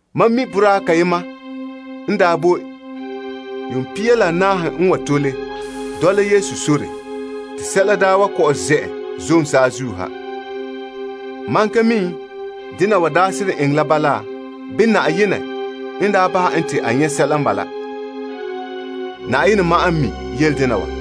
Mam mi boraa kayema n daa boe yuun pia la naahe n wana n tole, dɔla Yesu sore te sɛla daa wa kɔ'ɔn zɛ' en zom saazuo saazuo ha. Mam ka mi dena wa daa seren eŋɛ la bala, bii Na'ayenɛ n daa bahɛ en te a nyɛ' sɛla n bala. Na'ayenɛ ma'an n mi yele dena wa.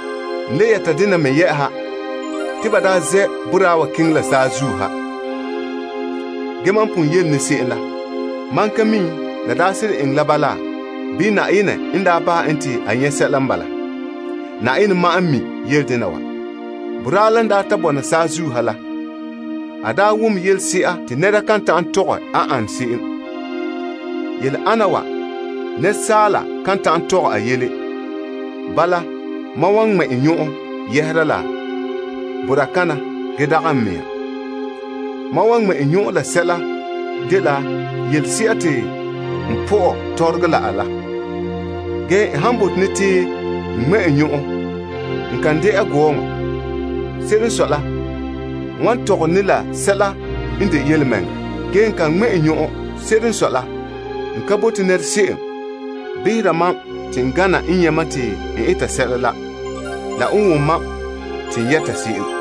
N le yɛta dena me yɛ'ɛha te ba daa zɛ' boraa wa keŋɛ la saazuo ha. Ge mam pon yele ne se'em la, mam ka mi la daa seren eŋɛ la bala, bii Na'ayenɛ n daa bahɛ en te a nyɛ' sɛla n bala. Na'ayenɛ ma'an n mi yele dena wa. Boraa la n daa ta bɔna saazuo ha la, a daa wom yelese'a te nɛra kan ta'an tɔgɛ a ane se'em. Yele ana wa, asaala kan ta'an tɔgɛ a yɛla. Bala mam wan ŋmɛ' n nyɔn'ɔn yɛhera la boraa kana ge dagɛ n mɛŋa. Mam wan ŋmɛ' n nyɔn'ɔn la sɛla dela yelese'a te n pɔ'ɛ tɔrɔgɔ la a la. Ge n han bote ne te n ŋmɛ' n nyɔn'ɔn, n kan dɛna gɔɔŋɔ. Se'ere n sɔe la, n wan tɔgɔre ne la sɛla n de yelemɛŋɛrɛ. Ge n kan ŋmɛ' n nyɔn'ɔn. Se'ere n sɔe la, n ka bote se'em behera mam te n gana n nyɛ' mam te n eta sɛla la, la n wom te n yɛta sɛla.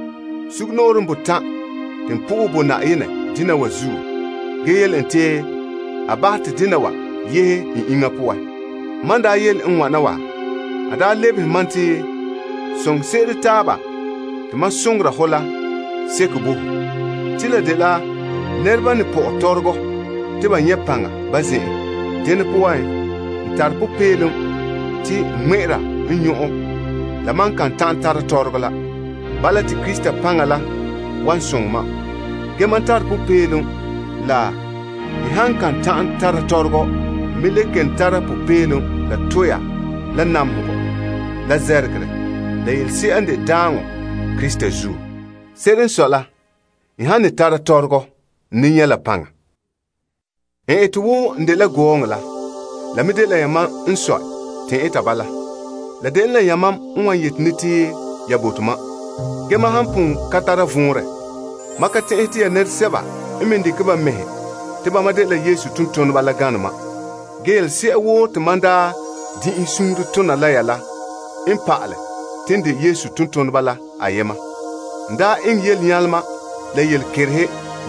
Sugumnɔɔren botan' te n sohɛ Na'ayenɛ dena wa zuo ge yele en te a bahɛ te dena wa yehe n iŋa poan. Mam n daa yele n wana wa, a daa lebehe mam te, Mam zo'ohogɔ la zo'e bo ho. Te la dela nɛreba n ne pɔ'ɛ tɔrɔgɔ te ba nyɛ' n paŋa ba zen'en. Dene poan, n tare popeelom te n ŋmɛ'ɛra n nyɔn'ɔn la mam kan ta'an tara tɔrɔgɔ la. Bala te Krista paŋa la wan soŋɛ mam. Ge mam tare popeelom la n han kan ta'an tara tɔrɔgɔ. N me le kelom tara popeelom la toore, la namehegɔ, la zɛrɛgerɛ, la yelese'a n de daaŋɔ Krista zuo. Se'ere n sɔe la, tɔrɔgɔ han paɛ mam, n ne nyɛ' la paŋa. N ete wo n dela gɔɔŋɔ la. La me dela yamam n sɔe te n eta bala. La dene la yamam n wan yeti ne te ya bote mam. Ge mam han pon ka tara vɔnrɛ, mam ka tɛn'ɛhɛ te ya nɛresɛba n me dekɛ ba mɛhe te bama dela Yesu tontoneba la gane mam. Ge yelese'a woo te mam daa din'inhe suunre tona la ya la n pa'alɛ te n de Yesu tontoneba la ayema. N daa eŋɛ yelenyalema, la yelekerehe.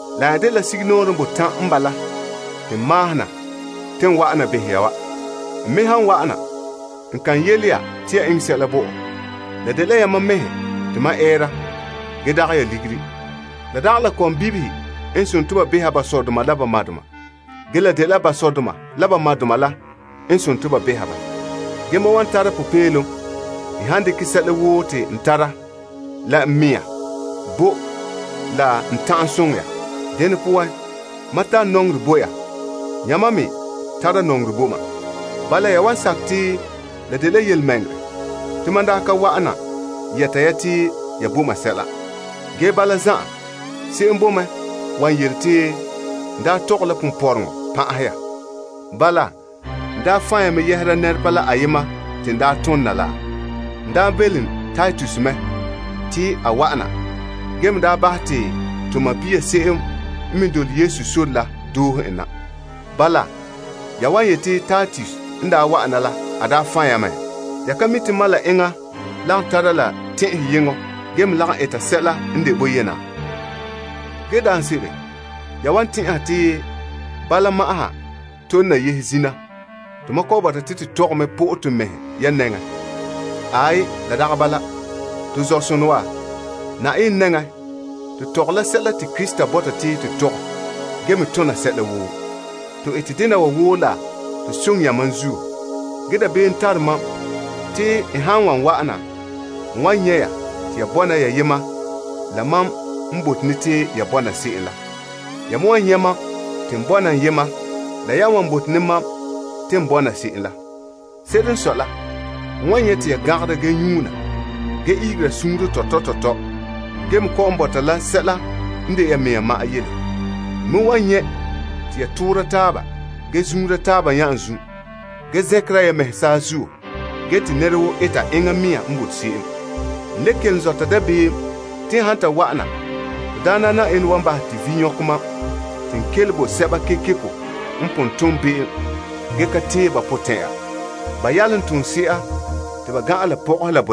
La nya dela sugumnɔɔren botan' n bala te n maahom na te n wa'ana behɛ ya. N me han wa'ana, n kan yele ya te ya eŋɛ sɛla bo mam. La dela yamam mɛhe te mam ɛɛra ge dagɛ ya ligiri. La dagɛ la kɔmbibihe n behere ba sɔdoma la ba madoma. Ge la dela ba sɔdoma la la madoma la n behere ba. Ge mam wan tara popeelom n han dekɛ sɛla woo te n tara la n mɛŋa bo la n ta'an soŋɛ ya. Dene poan, mam han nɔŋɛ ya zo'e wana, yamam nɔŋɛ mam fiin. Bala ya wan sakɛ te la dela yelemɛŋɛrɛ te mam daa ka wa'ana yɛta ya te ya bo mam sɛla. Ge bala zan'an, se'em boe mɛ wan yele te n daa pan'ahɛ ya. Bala, n daa fan' ya mɛ yɛhera nɛreba la te n daa tom na la ayema poan? N daa belom Titus mɛ te wa'ana ge me daa bahɛ te to sɔɔn se'em n me dole Yesu sore la doohe en na. Bala, ya wan yete Titus n daa wa'ana la, a daa fan' ya mɛ. Ya ka mi mam la enŋa lagom tara la tɛn'ɛheyeŋɔ ge me lagom eta sɛla n de boyena? Ge daanse'ere ya wan tɛn'ɛha te bala ma'an ha tole la yehe zina, tomam kɔ'ɔn bɔta te to tɔgɛ mɛ pɔ'ɛ to mɛhe ya nɛŋan. Aai. To zɔ'sonɔ wa, Na'ayenɛ nɛŋa to tɔgɛ la sɛla te Krista bɔta te to tɔgɛ ge me tona sɛla woo, te to soŋɛ yamam. Ge dabeem tare mam te n han wan wa'ana, n wan nyɛ' ya te ya ka bɔna wo mam n bote ya bɔna se'em la. Ya me wan nyɛ' mam te n ka bɔna wo yamam n bote mam bɔna se'em la. Se'ere n sɔe la, te n wan nyɛ' te ya gangara ge nyuuna, ge ihegera sunsunya tɔtɔ tɔtɔ ge me kɔ'ɔn bɔta la sɛla n de ya mɛhe ma'an yɛla. N me wan nyɛ' te ya toora taaba ge zuunra taaba nya'anzum, ge zɛnkera ya mɛhe saazuo ge te nɛra woo eta enŋa mɛŋa n bote se'em. N le kelom zɔta dabeem te n han ta wa'ana, to Daana Na'ayenɛ wan bahɛ mam te vi' nyɔkɛ mam te n kele bo sɛba kekeko n pon tom be'em ge ka tee ba potɛn'ya ba yalomtooma la poan.